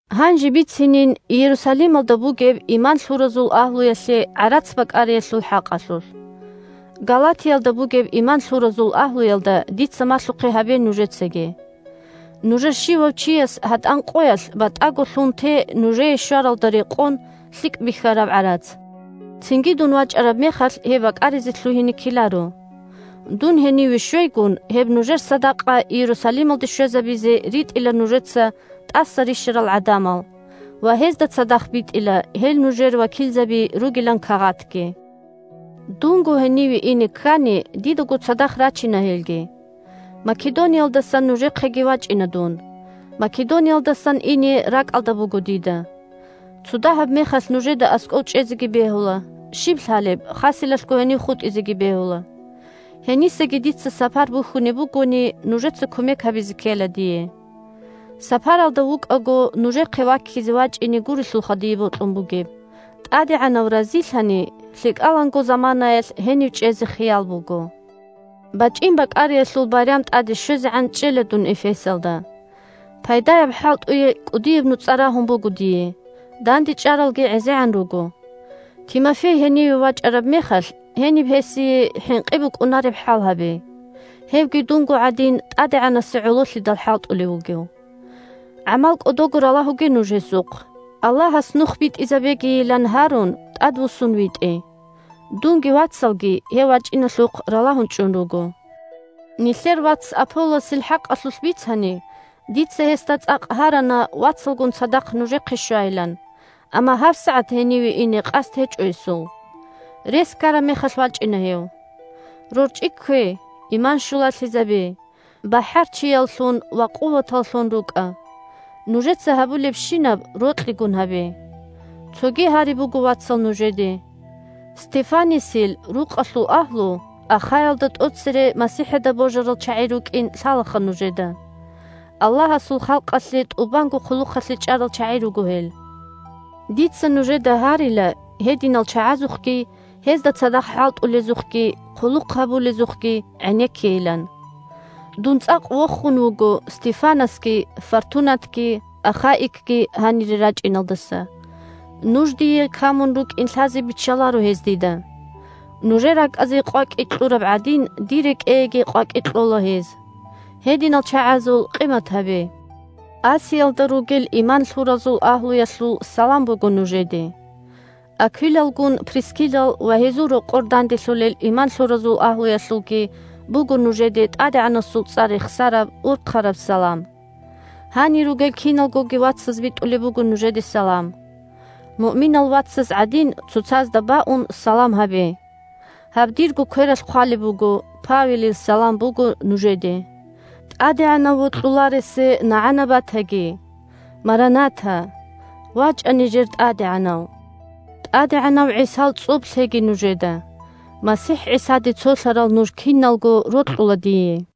Гьанже бицинин Иерусалималда бугеб иман лъуразул агьлуялъе гӀарац бакӀариялъул хӀакъалъулъ. Галатиялда бугеб иман лъуразул агьлуялда дица малъухъе гьабе нужецаги. Нужер щивав чияс гьатӀан къоялъ батӀаго лъун те нужее щваралда рекъон лъикӀ бихьараб гӀарац. Цинги дун вачӀараб мехалъ гьеб бакӀаризе лъугьине ккеларо. Дун гьениве щвейгун, гьеб нужер садакъа Иерусалималде щвезабизе ритӀила нужеца тӀаса рищарал гӀадамал ва гьезда цадахъ битӀила гьел нужер вакилзаби ругилан кагъатги. Дунго гьениве ине ккани, дидаго цадахъ рачина гьелги. Македониялдаса нужехъеги вачӀина дун – Македониялдасан ине ракӀалда буго дида. Цодагьаб мехалъ нужеда аскӀов чӀезеги бегьула, щиб лъалеб, хаселалъго гьенив хутӀизеги бегьула. Гьенисаги дица сапар бухьунеб бугони, нужеца кумек гьабизе ккела дие. Сапаралда вукӀаго нужехъе ваккизе вачӀине гурелъулха дие бокьун бугеб, ТӀадегӀанав разилъани, лъикӀаланго заманаялъ гьенив чӀезе хиял буго. БачӀин бакӀариялъул байрам тӀаде щвезегӀан чӀела дун Эфесалда. Пайдаяб хӀалтӀуе кӀудияб нуцӀа рагьун буго дие, дандечӀаралги гӀезегӀан руго. Тимофей гьениве вачӀараб мехалъ, гьениб гьесие хӀинкъи букӀунареб хӀал гьабе. Гьевги, дунго гӀадин, ТӀадегӀанасе гӀололъидалха хӀалтӀулев вугев. ГӀамал кӀодого ралагьуге нуж гьесухъ. Аллагьас нух битӀизабегийилан гьарун тӀадвуссун витӀе. Дунги вацалги гьев вачӀиналъухъ ралагьун чӀун руго. Нилъер вац Аполлосил хӀакъалъулъ бицани, дица гьесда цӀакъ гьарана вацалгун цадахъ нужехъе щвайилан, амма гьабсагӀат гьениве ине къасд гьечӀо гьесул. Рес ккараб мехалъ вачӀина гьев. РорчӀи ккве, иман щулалъизабе, бахӀарчияллъун ва къуваталлъун рукӀа. Нужеца гьабулебщинаб рокьигун гьабе. Цоги гьари буго, вацал, нужеде: Стефанасил рукъалъул агьлу Ахаялда тӀоцере МасихӀида божарал чагӀи рукӀин лъалаха нужеда. Аллагьасул халкъалъе тӀубанго хъулухъалъе чӀарал чагӀи руго гьел. Дица нужеда гьарила гьединал чагӀазухъги, гьезда цадахъ хӀалтӀулезухъги, хъулухъ гьабулезухъги гӀенеккейилан. Дун цӀакъ вохун вуго Стефанасги, Фортунатги, Ахаикги гьанире рачӀиналдаса. Нуж дие камун рукӀин лъазе биччаларо гьез дида. Нужер ракӀазе къвакӀи кьураб гӀадин, дир рекӀееги къвакӀи кьола гьез. Гьединал чагӀазул къимат гьабе! Асиялда ругел иман лъуразул агьлуялъул салам буго нужеде. Аквилалгун Прискиллал ва гьезул рокъор данделъулел иман лъуразул агьлуялъулги буго нужеде ТӀадегӀанасул цӀар рехсараб, урхъараб салам. Гьанир ругел киналгоги вацаз битӀулеб буго нужеде салам. Муъминал вацаз гӀадин, цоцазда баун, салам гьабе. Гьаб дирго квералъ хъвалеб буго: Павелил салам буго нужеде. ТӀадегӀанав вокьуларесе нагӀана батаги! «Марана-та!» – вачӀа, нижер ТӀадегӀанав! ТӀадегӀанав ГӀисал цӀоб лъеги нужеда! МасихӀ ГӀисаде цолъарал нуж киналго рокьула дие.